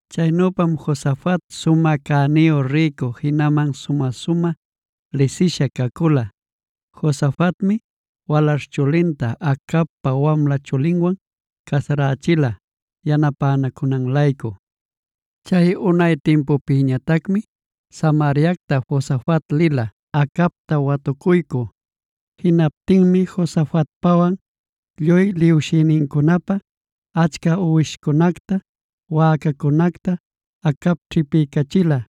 Chaynüpam Josafat sumä cäniyu rïcu, jinaman sumä-sumä lisisha cacula. Josafatmi walaśh chulinta Acabpa wamla chulinwan casarächila yanapänacunan-laycu. Chay unay timpupïñatacmi Samariacta Josafat lila Acabta watucuycü. Jinaptinmi Josafatpäwan lluy liwshïnincunapä achca uwishcunacta, wäcacunacta Acab ćhipiycachila.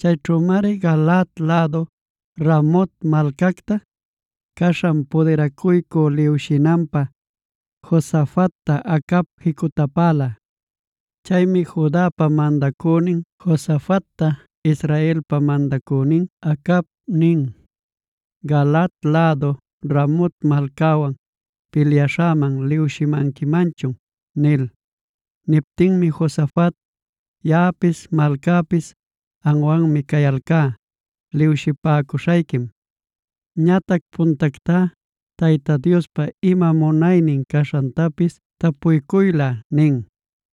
Chayćhümari Galaad lädu Ramot malcacta caśhan pudiracuycü liwshinanpä, Josafatta Acab jicutapäla. Chaymi Judapa mandacünin Josafatta Israelpa mandacünin Acab nin: “¿Galaad lädu Ramot malcawan pilyaśhäman liwshimanquimanchun?” nil. Niptinmi Josafat: “Yaꞌapis malcäpis amwanmi cayalcá. Liwshipäcuśhayquim. Ñatac puntactá Tayta Diospa ima munaynin caśhantapis tapuycuylä” nin.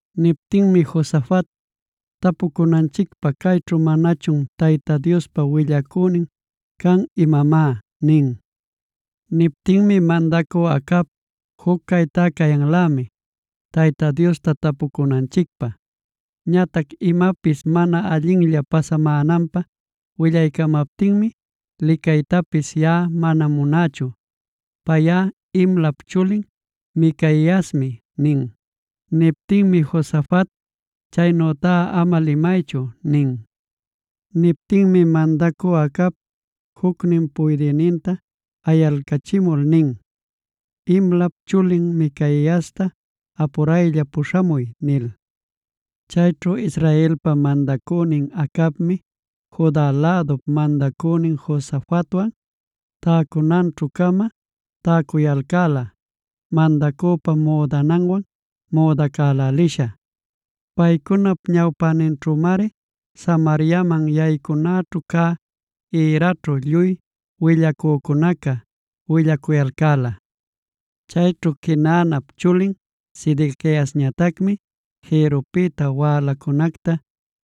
Niptinmi Josafat: “¿Tapucunanchicpä, cayćhu manachun Tayta Diospa willacünin can imamá?” nin. Niptinmi mandacü Acab: “Juc caytá cayanlämi Tayta Diosta tapuycunanchicpä. Ñatac imapis mana allinlla pasamänanpä willaycamaptinmi licaytapis yaꞌa mana munächu. Payꞌa Imlap chulin Micaiasmi” nin. Niptinmi Josafat: “Chaynütá ama limaychu” nin. Niptinmi mandacü Acab, jucnin puydïninta ayalcachimul nin: “Imlap chulin Micaiasta apuraylla puśhamuy” nil. Chayćhu Israelpa mandacünin Acabmi, Juda lädup mandacünin Josafatwan, täcunanćhu-cama täcuyalcäla mandacüpa müdananwan müdacälälisha. Paycunap ñawpäninćhümari Samariaman yaycunaćhu cä ïraćhu, lluy willacücunaca willacuyalcäla. Chayćhu Quenaanap chulin Sedequiasñatacmi jïrrupïta wälacunacta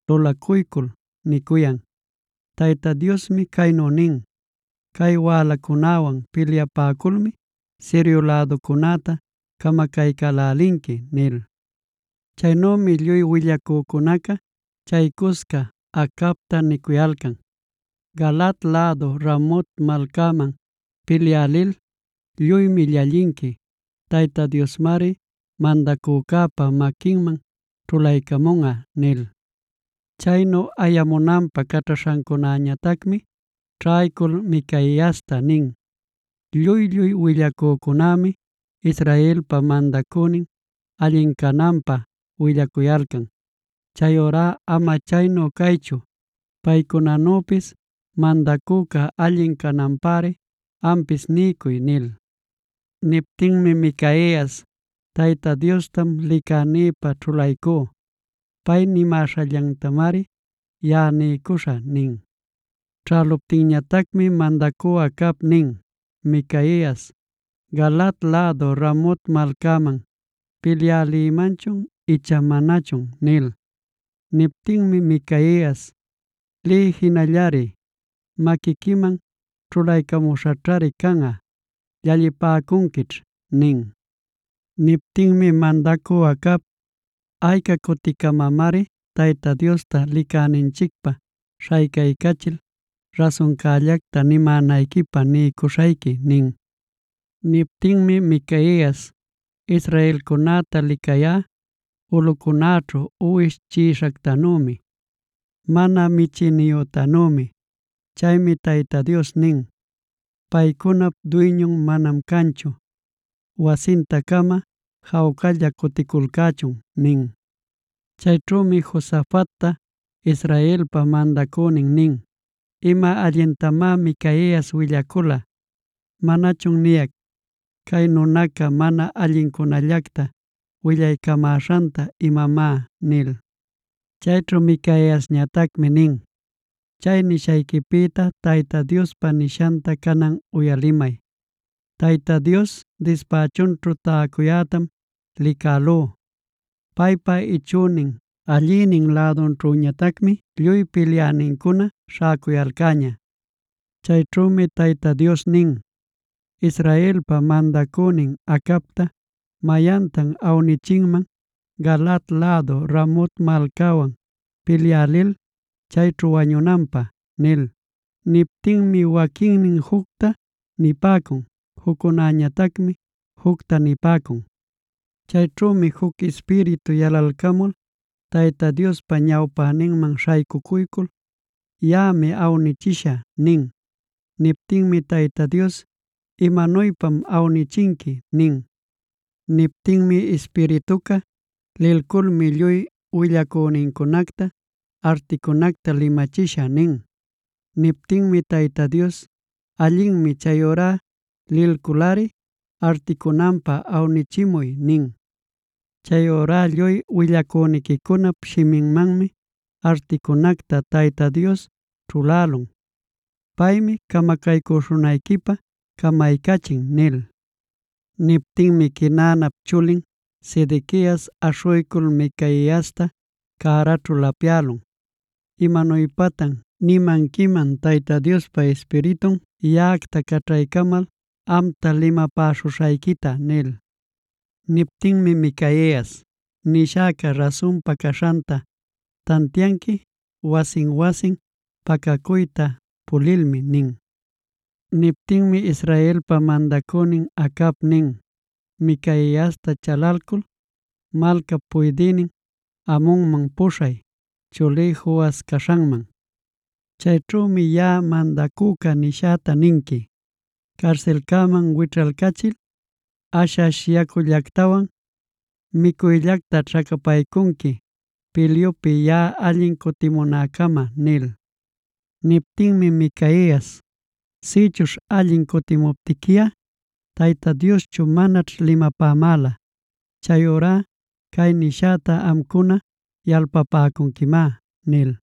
lulacuycul nicuyan: “Tayta Diosmi caynu nin: ‘Cay wälacunäwan pilyapäculmi Sirio läducunäta camacaycälälinqui’” nil. Chaynümi lluy willacücunaca chay cusca Acabta nicuyalcan: “Galaad lädu Ramot malcaman pilyä lil, lluymi llallinqui. Tayta Diosmari mandacücäpa maquinman ćhulaycamunꞌa” nil. Chaynu ayamunanpä caćhaśhancäñatacmi ćhaycul Micaiasta nin: “Lluy-lluy willacücunämi Israelpa mandacünin allin cananpä willacuyalcan. Chayurá ama chaynu caychu, paycunanüpis mandacüca allin cananpäri ampis niycuy” nil. Niptinmi Micaias: “Tayta Diostam licänïpä ćhulaycú. Pay nimäśhallantamari yaꞌa niycuśhä” nin. Ćhäluptinñatacmi mandacü Acab nin: “Micaias, ¿Galaad lädu Ramot malcaman pilyä lïmanchun icha manachun?” nil. Niptinmi Micaias: “Liy jinallari, maquiquiman ćhulaycamuśhaćhari canꞌa; llallipäcunquićh” nin. Niptinmi mandacü Acab: “¿Ayca cuticamamari Tayta Diosta licäninchicpä śhaycaycachil rasuncällacta nimänayquipä niycuśhayqui?” nin. Niptinmi Micaias: “Israelcunäta licayá, ulꞌucunäćhu uwish chiꞌishactanümi, mana michïniyütanümi.a Chaymi Tayta Dios nin: ‘Paycunap duyñun manam canchu. Wasinta-cama jawcalla cuticulcächun’” nin. Chayćhümi Josafatta, Israelpa mandacünin nin: “Ima allintamá Micaias willacula. ¿Manachun niyac, cay nunaca mana allincunallacta willaycamäśhanta imamá?” nil. Chayćhu Micaiasñatacmi nin: “Chay nishayquipïta Tayta Diospa nishanta canan uyalimay. Tayta Dios dispächunćhu täcuyätam licälú. Paypa ichünin allïnin lädunćhüñatacmi lluy pilyänincuna śhäcuyalcäña. Chayćhümi Tayta Dios nin: ‘¿Israelpa mandacünin Acabta mayantan awnichinman Galaad lädu Ramot malcawan pilyä lil chayćhu wañunanpä?’ nil. Niptinmi waquinnin jucta nipäcun, juccunäñatacmi jucta nipäcun. Chayćhümi juc ispiritu yalalcamul Tayta Diospa ñawpäninman śhaycucuycul: ‘Yaꞌami awnïchishä’ nin. Niptinmi Tayta Dios: ‘¿Imanuypam awnichinqui?’ nin. Niptinmi ispirituca: ‘Lilculmi lluy willacünincunacta articunacta limachishä’ nin. Niptinmi Tayta Dios: ‘Allinmi, chayurá lilculꞌari articunanpä awnichimuy’ nin. Chayurá lluy willacüniquicunap shiminmanmi articunacta Tayta Dios ćhulälun. Paymi camacaycüśhunayquipä camaycachin” nil. Niptinmi Quenaanap chulin Sedequias aśhuycul Micaiasta cäraćhu lapyälun: “¿Imanuypatan nimanquiman Tayta Diospa ispiritun yaꞌacta caćhaycamal amta limapäśhuśhayquita?” nil. Niptinmi Micaias: “Nishäca rasunpa caśhanta tantianqui wasin-wasin pacacuyta pulilmi” nin. Niptinmi Israelpa mandacünin Acab nin: “Micaiasta chalalcul malcap puydïnin Amonman puśhay, chulí Joas caśhanman. Chayćhümi yaꞌa mandacüca nishäta ninqui: ‘Carsilcäman wićhaycachil ash-ash yacullactawan micuyllacta ćhacapaycunqui, pilyupi yaꞌa allin cutimunäcama’” nil. Niptinmi Micaias: “Sïchuśh allin cutïmuptiquiꞌa Tayta Dioschu manaćh limapämäla. Chayurá cay nishäta amcuna, yalpapäcunquimá” nil.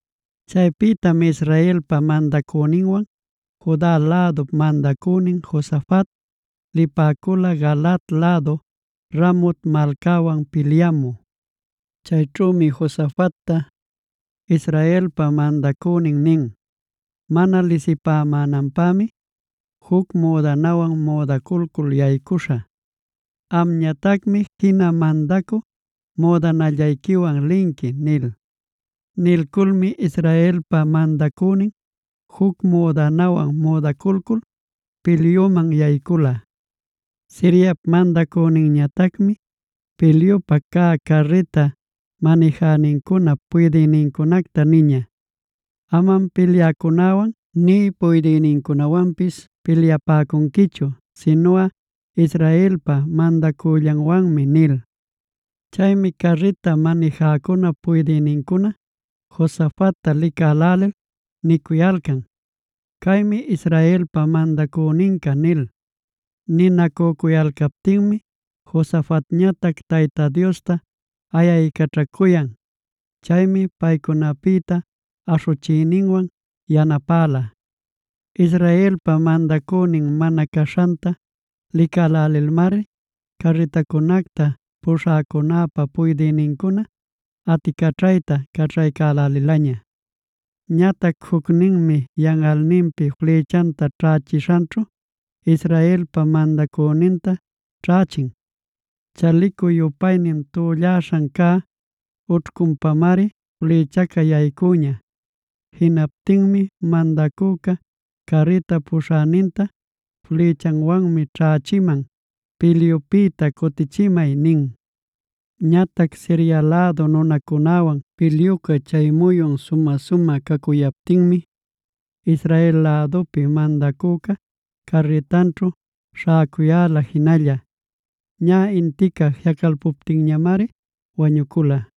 Chaypïtam Israelpa mandacüninwan Juda lädup mandacünin Josafat, lipäcula Galaad lädu Ramot malcawan pilyamü. Chayćhümi Josafatta, Israelpa mandacünin nin: “Mana lisipämänanpämi juc müdanawan müdaculcul yaycuśhä. Amñatacmi jina mandacü müdanallayquiwan linqui” nil. Nilculmi Israelpa mandacünin juc müdanawan müdaculcul pilyuman yaycula. Siriap mandacüninñatacmi pilyupä cä carrita manijänincunap puydïnincunacta niña: “Amam pilyäcunäwan nï puydïnincunawanpis pilyapäcunquichu; sinuꞌa Israelpa mandacüllanwanmi” nil. Chaymi carrita manijäcunap puydïnincuna, Josafatta licälälil nicuyalcan: “Caymi Israelpa mandacüninca” nil. Ninacücuyalcaptinmi Josafatñatac Tayta Diosta ayaycaćhacuyan; chaymi paycunapïta aśhuchiyninwan yanapäla. Israelpa mandacünin mana caśhanta licälälilmari carritacunacta puśhäcunäpa puydïnincuna aticaćhayta caćhaycälälilaña. Ñatac jucninmi yanꞌalninpi flïchanta ćhächishanćhu Israelpa mandacüninta ćhächin. Chalicu-yupaynin tüllaśhan cä ućhcunpamari flïchaca yaycüña. Jinaptinmi mandacüca carrita puśhäninta: “Flïchawanmi ćhächiman; pilyupïta cutichimay” nin. Ñatac Siria lädu nunacunäwan pilyuca chay muyun sumä-sumä cacuyaptinmi, Israel lädupi mandacüca carritanćhu śhäcuyäla jinalla. Ñä intica jiꞌacalpuptinñamari wañucula.